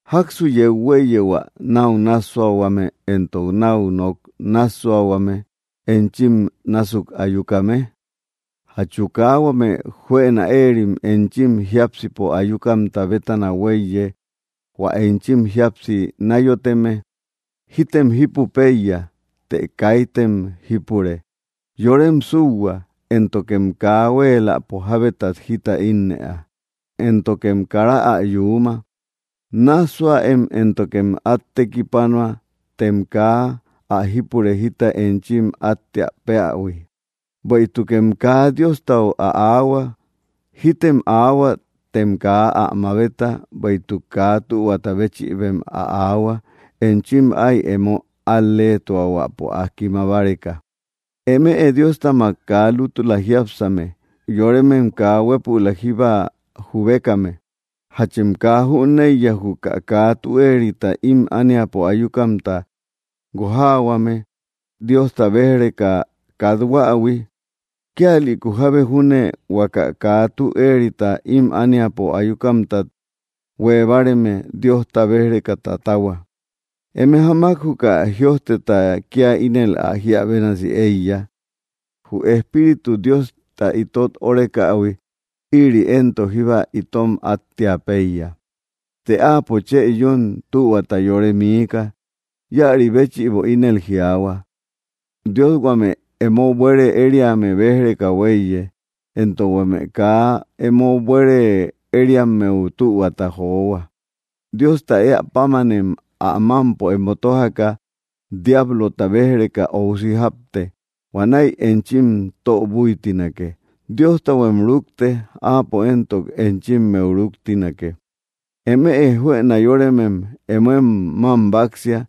¿Jáksu yeu huéiye hua náu nássuahuame éntok náu nok nássuahuame enchim násuk ayukame? ¿Jachu kaa huame juëna éerim enchim jiápsipo ayukamta bétana huéiye, hua enchim jíapsi náyoteme? Jítem jípu péiya, të kaitëm jípure; yorem súuhua, éntokem kaa huéeläpo jábetat jita ínnëa, éntokem kara ä yuuma. Nássuäem éntokem át tekipanua, tem kaa ä jípure jita enchim áttea péähui, bueïtukem kaa Diostau ä aahua. Jítem aahua, tem kaa ä mabeta, bueïtuk kaa tühuata béchïbem ä aahua, enchim áy emo al‑leetuahuäpo ä kima báreka. ¡Eme Diostamak kaa lútula jiápsame, yoremem kaa huépülak jíba jubekame! ¿Jachem kaa jüneiya, juka kaa tü éerita ím ániapo ayukamta guojaahuame Diosta béj‑reka kathuähui? Kíalïku jábe junne huaka kaa tü éerita ím ániapo ayukamtat huée báareme, Diosta béj‑reka tatahua. Eme jamak juka jïojteta kía ínel ä jíä bénasi éiya: “Jü Espíritu, Diosta itot órekähui; ïri éntok jíba itom áttea péiya.” Të Áapo chë yún tühuata yore miika. Íäri béchïbo ínel jiaahua: “Dios huame emo buere ériame béj‑reka huéiye, éntok huame kaa emo buere ériammeu tühuata johua.” Diosta éä pámanem ä mámpo emo tójaka, diablota béj‑reka óusi jápte; huanäi enchim tö búitinake. Diostahuem rúkte; Áapo éntok enchimmeu rúktinake. Emëe juëna yóremem emoem mám báksia;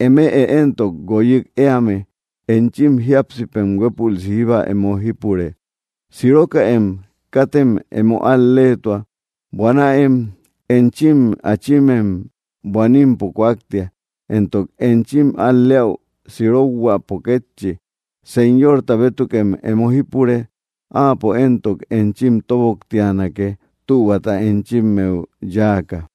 eme éntok guoyik éame, enchim jíapsipem huépülsi jíba emo jípure. Sirokäem; katem emo al‑leetua; buanäem. Enchim achimem buanimpo kúaktia, éntok enchim al‑leäu sirokhuäpo kétchi. Señorta bétukem emo jípure; Áapo éntok enchim tóboktianake, tühuata enchimmeu yáaka.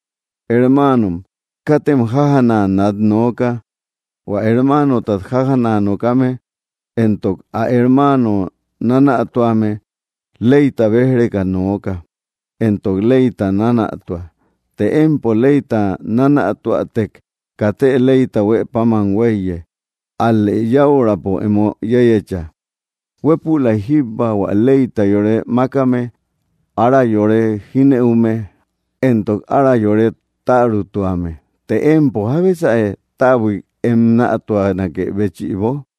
Hermaanom, katem jájana nat nooka. Huä hermanotat jájana nokame entok ä hermaano nánätuame, leyta béj‑reka nooka, entok leyta nánätua. Të empo leyta nánätuätek, katë leyta huë páman huéiye, ál‑lë yäurapo emo yéyecha. Huépülay jíba hua leyta yore mákame, ára yore jínëume, entok ára yore tärutuame. Të, ¿empo? ¿Jábesäe, täbuik em nätuanakë béchïbo?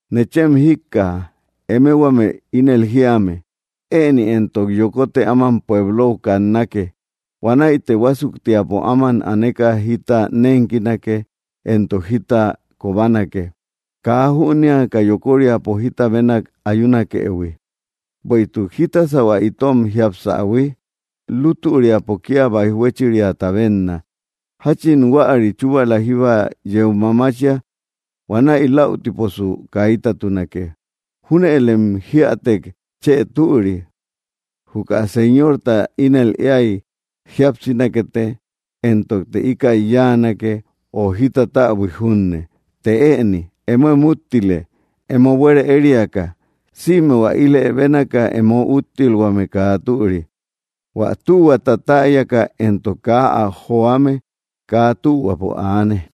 Nechem jíkkaja, eme huame ínel jíame: “Ëni entok yokote áman pueblou kannake; huanäite huásuktiapo áman aneka jita nénkinake entok jita kobanake”, kaa jünéaka yokoríapo jita bénak ayunakëhui. Bueïtuk, ¿jítasä hua itom jiapsähui? Lútüriapo kía báij huéchiriata bénna, jáchin huäri chúbala jíba yeu mamachia. Huanäi läutiposu kaitatunake. Júnëlem jíätek chë türi: “Juka Señorta ínel éay, jíapsinakete, éntokte íkäi yáanake, o jita täbuik junne.” Të ëni emoem úttile, emo buere ériaka. Sïme hua ílë bénaka emo úttilhuame kaa türi. Huä tühuata täyaka, entok kaa ä joame, kaa tühuapo aane.